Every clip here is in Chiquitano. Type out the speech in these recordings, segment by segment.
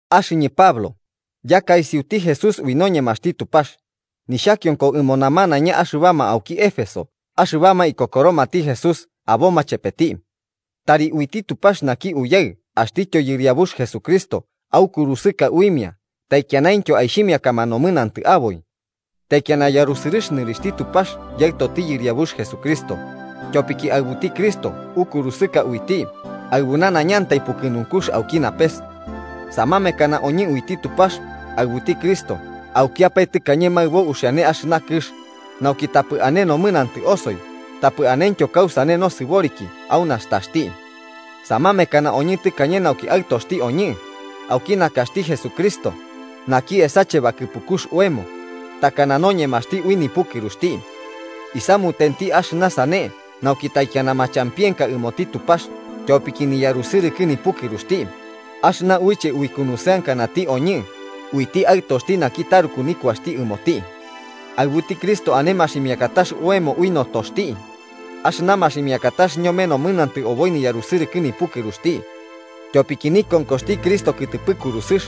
Axɨñɨ Pablo, yaka isiuti Jesús ui noñemaxti Tupax, nixhakionko ɨmo namanaiña axɨbama auki Éfeso axɨbama ikokoromati Jesús aboma chepeti. Tari uiti Tupax naki Uyaɨ axtityo Yɨriabux Jesucristo aukurusɨka uimia taikianaintyo aixhimiakama nomɨnantɨ aboi. Taikiana yarusɨrɨx nɨrixhti Tupax Yaɨtoti Yɨriabux Jesucristo, tyopiki aɨbuti Cristo ukurusɨka uiti aɨbu nanaiñantai pukɨnunkux auki napes. Samamekana oñɨ uiti Tupax aɨbuti Cristo aukiapae tɨkañe maɨbo uxiane axɨna kɨx, nauki tapɨ ane nomɨnantɨ osoi tapɨ anentyo kausane nosɨboriki au nastaxti. Samamekana oñɨ tɨkañe nauki aɨtoxti oñɨ, auki nakaxti Jesucristo, naki esache bakɨpukux oemo, takana noñemaxti ui nipukɨruxti. Isamutenti axɨna sane nauki taikiana machampienka ɨmoti Tupax tyopiki niyarusɨrɨkɨ nipukɨruxti, axɨna uiche aikunusɨankanati oñɨ uiti Aɨtoxti naki taruku nikuaxti ɨmoti. Aɨbuti Cristo ane maximiakatax oemo ui notoxti, axɨna maximiakatax ñome nomɨnantɨ oboi niyarusɨrɨkɨ nipukɨruxti. Tyopiki nikonkoxti Cristo kɨtɨpɨ kurusɨx,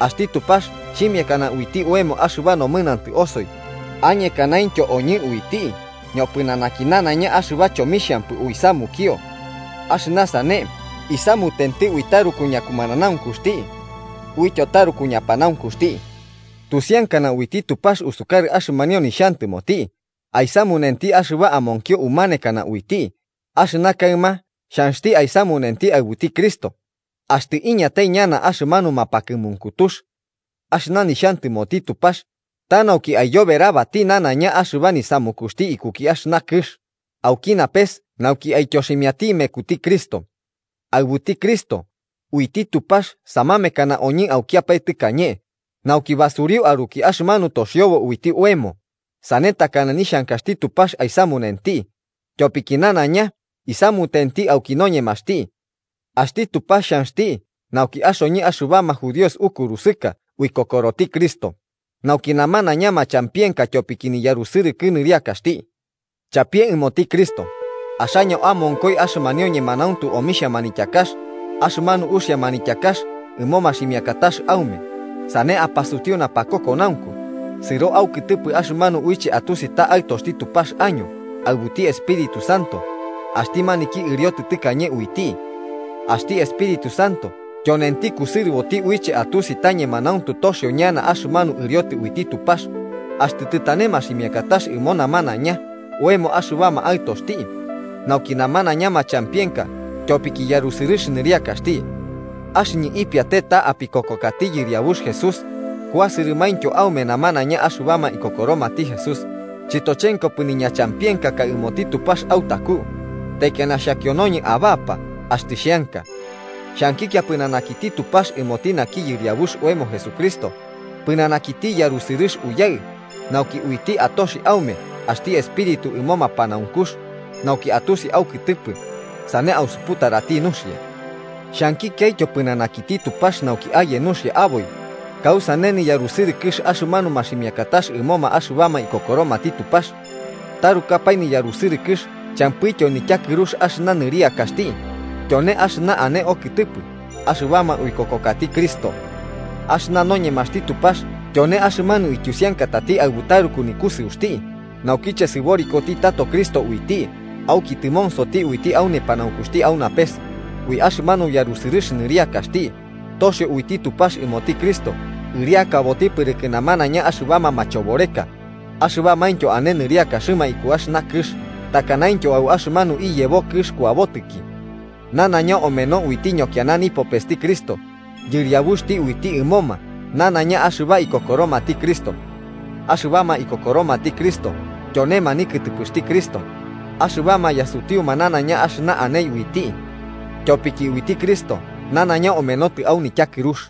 axti Tupax xhimiakana uiti oemo axɨba nomɨnantɨ osoi añekanaintyo oñɨ uiti ñopɨnanaki nanaiña axɨba chomixhampɨ uisamukio. Axɨna sane isamutenti ui taruku ñakumananaunkuxti. Uityo taruku ñapanaunkuxti, tusiankana uiti Tupax usukarɨ axɨmanio nixhantɨmoti aisamunenti axɨba amonkio umanekana uiti axɨna kaɨma xhanxti aisamunenti aɨbuti Cristo, axtɨ iñatai ñana axɨmanu mapakɨmunkutux. Axɨna nixhantɨmoti Tupax ta nauki aiyoberabatati nanaiña axɨba nisamukuxti ikuki axɨna kɨx auki napes nauki aityoximiati mekuti Cristo. Aɨbuti Cristo, uiti Tupax samamekana oñɨ aukiapae tɨkañe nauki basuriu aruki axɨmanu toxiobo uiti oemo, sane takana nixhankaxti Tupax aisamunenti, tyopiki nanaiña isamunenti auki noñemaxti. Axti Tupax xhanxti nauki axoñɨ axɨbama judíos ukusɨrɨka uikokoroti Cristo, nauki namanaiña machampienka tyopiki niyarusɨrɨkɨ nɨriakaxti. Chapie ɨmoti Cristo, axaño amonkoi axɨmanio ñemanauntu omixhia manityakax, axɨmanu uxia manityakax ɨmo maximiakatax aume, sane apasutiu napakokonaunku, sɨro aukɨtɨpɨ axɨmanu uiche atusi ta aɨtoxti Tupax año aɨbuti Espíritu Santo axti maniki ɨriotɨ tɨkañe uiti. Axti Espíritu Santo tyonenti kusɨrɨboti uiche atusi ta ñemanauntu toxio ñana axɨmanu ɨriotɨ uiti Tupax, axtɨ tɨtane maximiakatax ɨmo namanaiña oemo axɨbama aɨtoxti, nauki namanaiña machampienka tyopki yarusɨrɨx nɨriakaxti. Axɨñɨ ipiate ta apikokokati Yɨriabux Jesús kuasɨrɨmaintyo aume namanaiña axɨbama ikokoromati Jesús, chɨtochenkopɨ niñachampienkaka ɨmoti Tupax autaku, taikiana xhakionoñɨ abapa axtɨ xheanka. Xhankikia pɨnanakiti Tupax ɨmoti naki Yɨriabux oemo Jesucristo, pɨnanakiti yarusɨrɨx Uyaɨ, nauki uiti atoxi aume axti espíritu ɨmo mapanaunkux, nauki atusi aukɨtɨpɨ, sane ausuputarati nuxia. Xhankikiaityo pɨnanakiti Tupax nauki aye nuxia aboi kausane niyarusɨrɨkɨx axɨmanu maximiakatax ɨmoma axɨbama ikokoromati Tupax. Tarukapae niyarusɨrɨkɨx champɨityo nityakɨrux axɨna nɨriakaxti, tyone axɨna ane okɨtɨpɨ axɨbama uikokokati Cristo. Axɨna noñemaxti Tupax tyone axɨmanu ityusiankatati aɨbu taruku nikusɨuxti naukiche sɨborikoti tato Cristo uiti auki tɨmonsoti uiti au nepanaunkuxti au napes, ui axɨmanu yarusɨrɨx nɨriakaxti, toxio uiti Tupax ɨmoti Cristo ɨriakaboti pɨrɨkɨ namanaiña axɨbama machoboreka axɨbamaintyo ane nɨriakaxɨma iku axɨna kɨx takanaintyo au axɨmanu iyebo kɨx kuabotɨki. Nanaiña omeno uiti ñokiana nipopesti Cristo, Yɨriabuxti uiti ɨmoma nanaiña axɨbama ikokoromati Cristo. Axɨbama ikokoromati Cristo tyonema nikɨtɨpɨxti Cristo, axɨbama yasutiuma nanaiña axɨna ane uiti. Tyopiki uiti Cristo nanaiña omenotɨ au nityakɨrux.